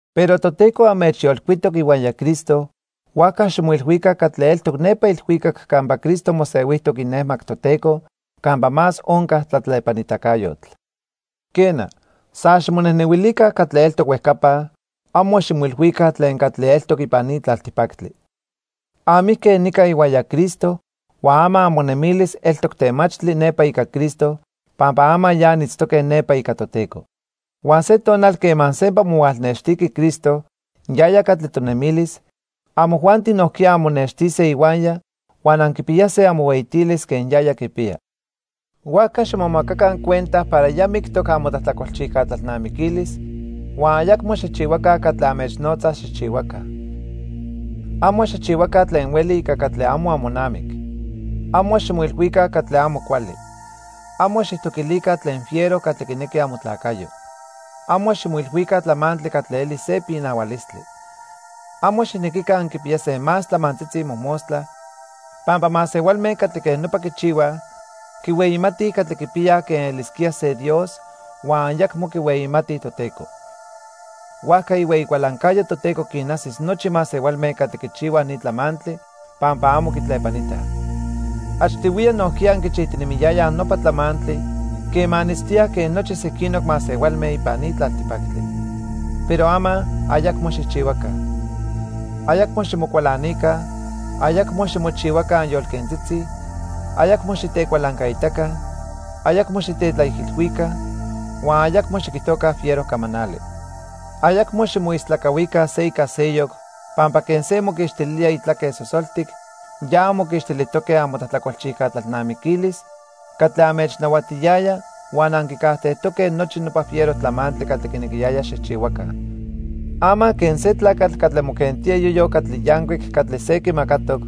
Pero Toteco anmechyolcuitoc ihuaya Cristo, huajca ximoilhuica catli eltoc nepa ilhuicac campa Cristo mosehuijtoc inejmac Toteco campa más onca tlatlepanitacayotl. Quena, san ximonejnehuilica catli eltoc huejcapa, amo ximoilhuica tlen catli eltoc ipan ni tlaltipactli. Anmijque nica ihuaya Cristo huan ama amonemilis eltoc temachtli nepa ica Cristo pampa ama ya anitztoque nepa ica Toteco. Huan se tonal quema sempa mohualnextiqui Cristo, yaya catli tonemilis, amojuanti nojquiya anmonextise ihuaya huan anquipiyase amohueyitilis quen yaya quipiya. Huajca ximomacaca cuenta para ya mictoc amotlajtlacolchijca tlalnamiquilis huan ayacmo xijchihuaca catli anmechnotza xijchihuaca. Amo xijchihuaca tlen hueli ica catli amo amonamic. Amo ximoilhuica catli amo cuali. Amo xijtoquilica tlen fiero catli quinequi amotlacayo. Amo ximoilhuica tlamantli catli eli se pinahualistli. Amo xijnequica anquipiyase más tlamantzitzi mojmostla, pampa masehualme catli quej nopa quichihuaj, quihueyimatij catli quipiyaj quen elisquía se dios huan ayacmo quihueyimatij Toteco. Huajca ihueyi cualancayo Toteco quinajsis nochi masehualme catli quichihuaj ni tlamantli pampa amo quitlepanitaj. Achtihuiya nojquiya anquichijtinemiyayaj nopa tlamantli quema anitztoyaj quen nochi sequinoc masehualme ipan ni tlaltipactli. Pero ama, ayacmo xijchihuaca. Ayacmo ximocualanica, ayacmo ximochihuaca anyolquentzitzi, ayacmo xitecualancaitaca, ayacmo xitetlaijilhuica, huan ayacmo xiquijtoca fiero camanali. Ayacmo ximoistlacahuica se ica seyoc pampa quen se moquixtilía itlaque sosoltic, ya anmoquixtilijtoque amotlajtlacolchijca tlalnamiquilis catli anmechnahuatiyaya huan anquicajtejtoque nochi nopa fiero tlamantli catli quinequiyaya xijchihuaca. Ama quen se tlacatl catli moquentía iyoyo catli yancuic catli se quimacatoc,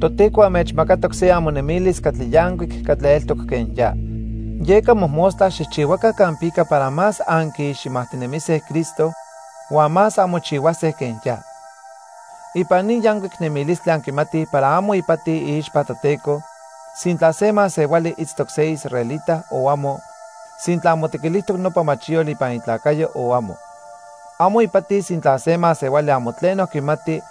Toteco anmechmacatoc se amonemilis catli yancuic catli eltoc quen ya. Yeca mojmostla xijchihuaca campica para más anquiiximajtinemise Cristo huan más anmochihuase quen ya. Ipan ni yancuic nemilistli anquimatij para amo ipati iixpa Toteco sintla se masehuali itztoc se israelita o amo, sintla motequilijtoc nopa machiyotl ipan itlacayo o amo. Amo ipati sintla se masehuali amo tleno quimati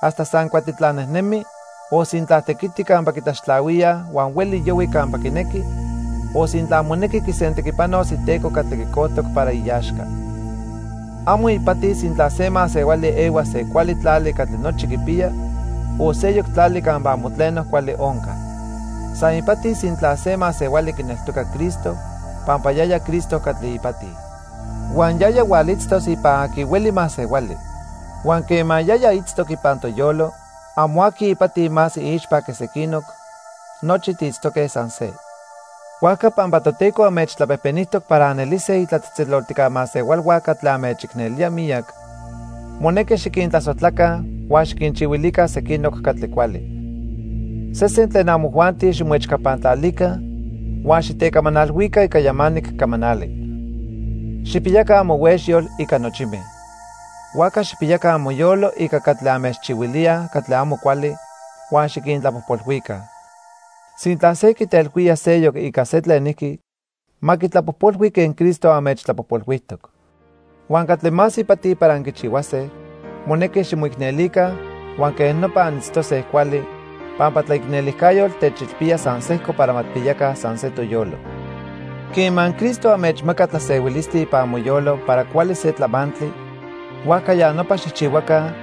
hasta san cuatitlan nejnemi, o sintla tequiti campa quitlaxtlahuía huan hueli yohui campa quinequi, o sintla monequi quisentequipanos iteco catli quicojtoc para iaxca. Amo ipati sintla se masehuali ehua se cuali tlali catli nochi quipiya, o seyoc tlali campa amo tleno cuali onca. San ipati sintla se masehuali quineltoca Cristo, pampa yaya Cristo catli ipati. Huan yaya hualitztos ipan aqui hueli masehuali. Huan quema yaya itztoc ipan toyolo, amo aqui ipati más iixpa que sequinoc, nochi tiitztoque san se. Huajca pampa Toteco anmechtlapejpenijtoc para anelise itlatzejtzeloltijca masehualhua catli anmechicnelía miyac, monequi xiquintlasojtlaca huan xiquinchihuilica sequinoc catli cuali. Sesen tlen amojuanti ximoechcapantlalica huan xitecamanalhuica ica yamanic camanali. Xijpiyaca amohuexyol ica nochime. Huajca xijpiyaca amoyolo ica catli anmechchihuilíaj catli amo cuali huan xiquintlapojpolhuica. Sintla se quitelhuía seyoc ica se tlenijqui, ma quitlapojpolhui quen Cristo anmechtlapojpolhuijtoc. Huan catli más ipati para anquichihuase, monequi ximoicnelica huan quej nopa anitztose cuali, pampa tlaicnelijcayotl techilpía san sejco para ma tijpiyaca san se toyolo. Quema Cristo anmechmaca tlasehuilistli ipan amoyolo para cuali se tlamantli, huajca ya nopa xijchihuaca,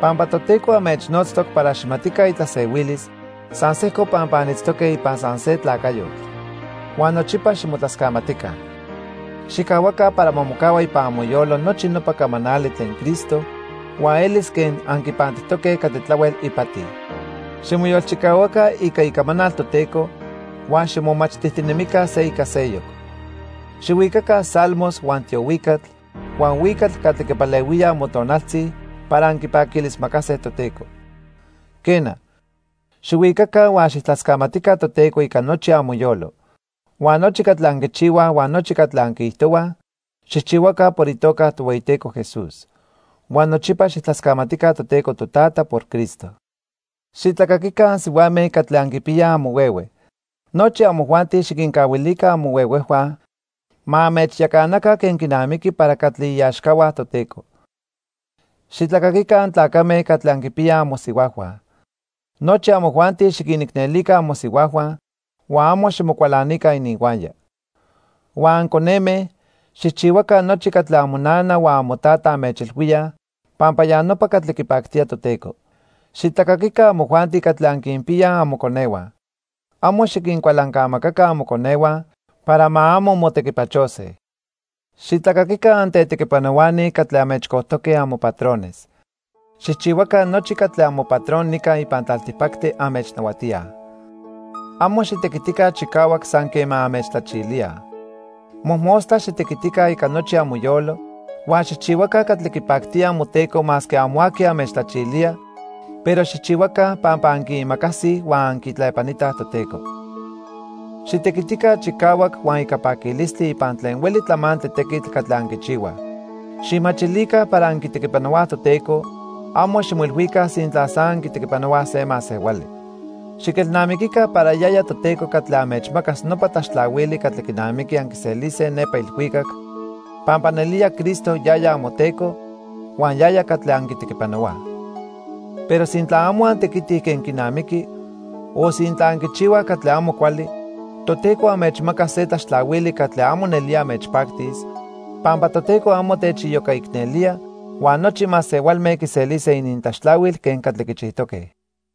pampa Toteco anmechnotztoc para xijmatica itlasehuilis san sejco pampa anitztoque ipan san se tlacayotl. Huan nochipa ximotlascamatica. Xijcahuaca para ma mocahua ipan amoyolo nochi nopa camanali tlen Cristo huan elis quen anquipantijtoque catli tlahuel ipati. Ximoyolchicahuaca ica icamanal Toteco huan ximomachtijtinemica se ica seyoc. Xihuicaca salmos, huan tiohuicatl, huan huicatl catli quipalehuía amotonaltzi para anquipaquilismacase Toteco. Quena, xihuicaca huan xijtlascamatica Toteco ica nochi amoyolo. Huan nochi catli anquichihuaj huan nochi catli anquiijtohuaj, xijchihuaca por itoca Tohueyiteco Jesús. Huan nochipa xijtlascamatica Toteco Totata por Cristo. Xitlacaquica ansihuame catli anquipiyaj amohuehue. Nochi amojuanti xiquincahuilica amohuehuejhua ma anmechyacanaca quen quinamiqui para catli iaxcahua Toteco. Xitlacaquica antlacame catli anquipiyaj amosihuajhua. Nochi amojuanti xiquinicnelica amosihuajhua huan amo ximocualanica ininhuaya. Huan anconeme, xijchihuaca nochi catli amonana huan amotata anmechilhuíaj pampa ya nopa catli quipactía Toteco. Xitlacaquica amojuanti catli anquinpiyaj amoconehua. Amo xiquincualancamacaca amoconehua para ma amo motequipachose. Xitlacaquica antetequipanohuani catli anmechcojtoque amopatrones. Xijchihuaca nochi catli amopatron nica ipan tlaltipactli anmechnahuatíaj. Amo xitequitica chicahuac san quema anmechtlachilíaj. Mojmostla xitequitica ica nochi amoyolo huan xijchihuaca catli quipactía amoteco masque amo aqui anmechtlachilía, pero xijchihuaca pampa anquiimacasij huan anquitlepanitaj Toteco. Xitequitica chicahuac huan ica paquilistli ipan tlen hueli tlamantli tequitl catli anquichihuaj. Xijmachilica para anquitequipanohuaj Toteco, amo ximoilhuica sintla san anquitequipanohuaj se masehuali. Xiquelnamiquica para yaya Toteco catli anmechmacas nopa tlaxtlahuili catli quinamiqui anquiselise nepa ilhuicac, pampa nelía Cristo yaya amoTeco huan yaya catli anquitequipanohuaj. Pero sintla amo antequitij quen quinamiqui o sintla anquichihuaj catli amo cuali, Toteco anmechmacas se tlaxtlahuili catli amo nelía anmechpactis, pampa Toteco amo techiyocaicnelía huan nochi masehualme quiselise inintlaxtlahuil quen catli quichijtoque.